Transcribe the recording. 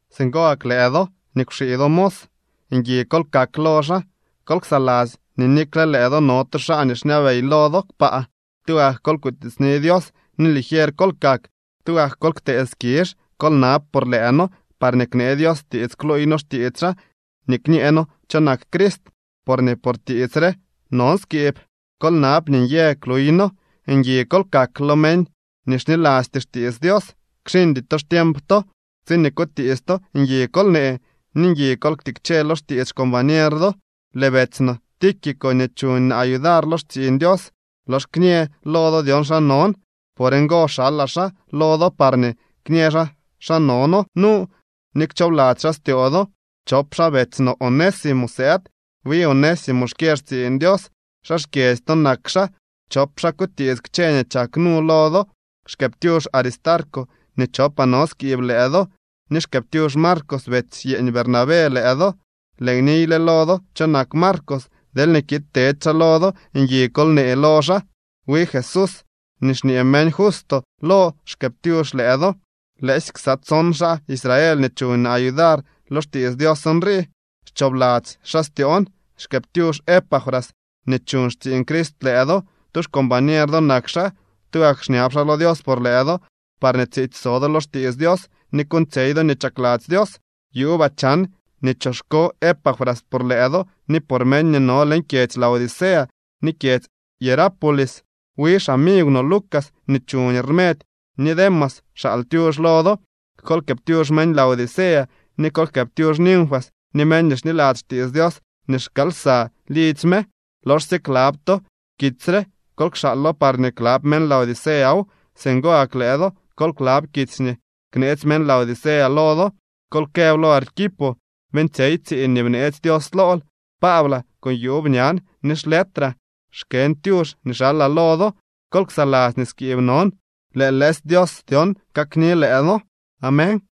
Singo gak lëë do nii kwxii do mos, ngui kol kak lo xaa. Kol ksaladzy nii nikle lëë do no tu xaa nii xñabey lo do kpaa. Tugak kol kutiitsni Dios ni ligier kol kak, tugak kol ktee skizh. Kol nab por lëë noo parñee knee Dios tiits kluuy noo xtiits xaa ni kñee noo cho nak Crist, porñee por tiits re non skiib. Kol nab nii nyë kluyno. Ngui kol kak lo meñ nii xnilasty xtiits Dios. Kxiñdy to xtiemp to. Tsiñee kutiits to, ngui kol nee, ni ngui kol ktikche lo xtiits xcombañer do. Lëë beetsy no Tíquico nii chuñ naa yudar lo xtsiiñ Dios lox kñë lo do dyon xa non. Por ngo xalaa xaa lo do parñee kñë xaa xa no noo nu ni kchoobladzy xaa styoo do. Chop xaa betsy no Onésimo sëëd. Wi Onésimo xkyë xtsiiñ Dios. Xaa xkyedzy to nak xaa. Chop xaa kutiits kchë nii chak nu lo do. Xkëëptyux Aristarco nii chopaa no skiib lëë do, ni xkëëptyux Marcos betsy yeeñ Bernabé lëë do. Lëën niyle lo do cho nak Marcos. Deelñee kiid tedy xaa lo do, ngui kol nee lo xaa. Wi Jesús nii xñee meñ Justo lo xkëëptyux lëë do. Lëësy ksa tson xaa Israel nii chuñ naa yudar lo xtiits Dios nrii. Xchoobladzy xaa styoon. Xkëëptyux Epafras nii chuuñ xtsiiñ Crist lëë do. Tu xcombañer do nak xaa. Tugak xñab xaa lo Dios por lëë do parñee tsiitsy so do lo xtiits Dios ni kuuñtsyey do nii chakladzy Dios. Yuubaa chan nii choxko Epafras por lëë do ni por meñ nii no leñ kyedzy Laodicea ni kyedzy Hierápolis. Wi xamigw no Lucas nii chuñ rmedy ni Demas xaal tyux lo do. Kol jkëëptyux meñ Laodicea. Ni kol jkëëptyux Ninfas ni meñ nii xniladzy xtiits Dios nii xkaal lsa lidzy me. Loxsye klab to kitsy re kol kxaalo parñee klab meñ Laodiceaw. Singo gak lëë do kol klab kitsy nii kneetsy meñ Laodicea lo do. Kol këb lo Arquipo: “Beeñtsyey tsiiñ nii bneetsy Dios lool.” Paablaa, con yuub ñan ni xletraa xkën tyux nii xalaa lo do. Kol ksaladzy nii skiib non. Lëë lëësy Dios dyon kakni lëë do. Amén.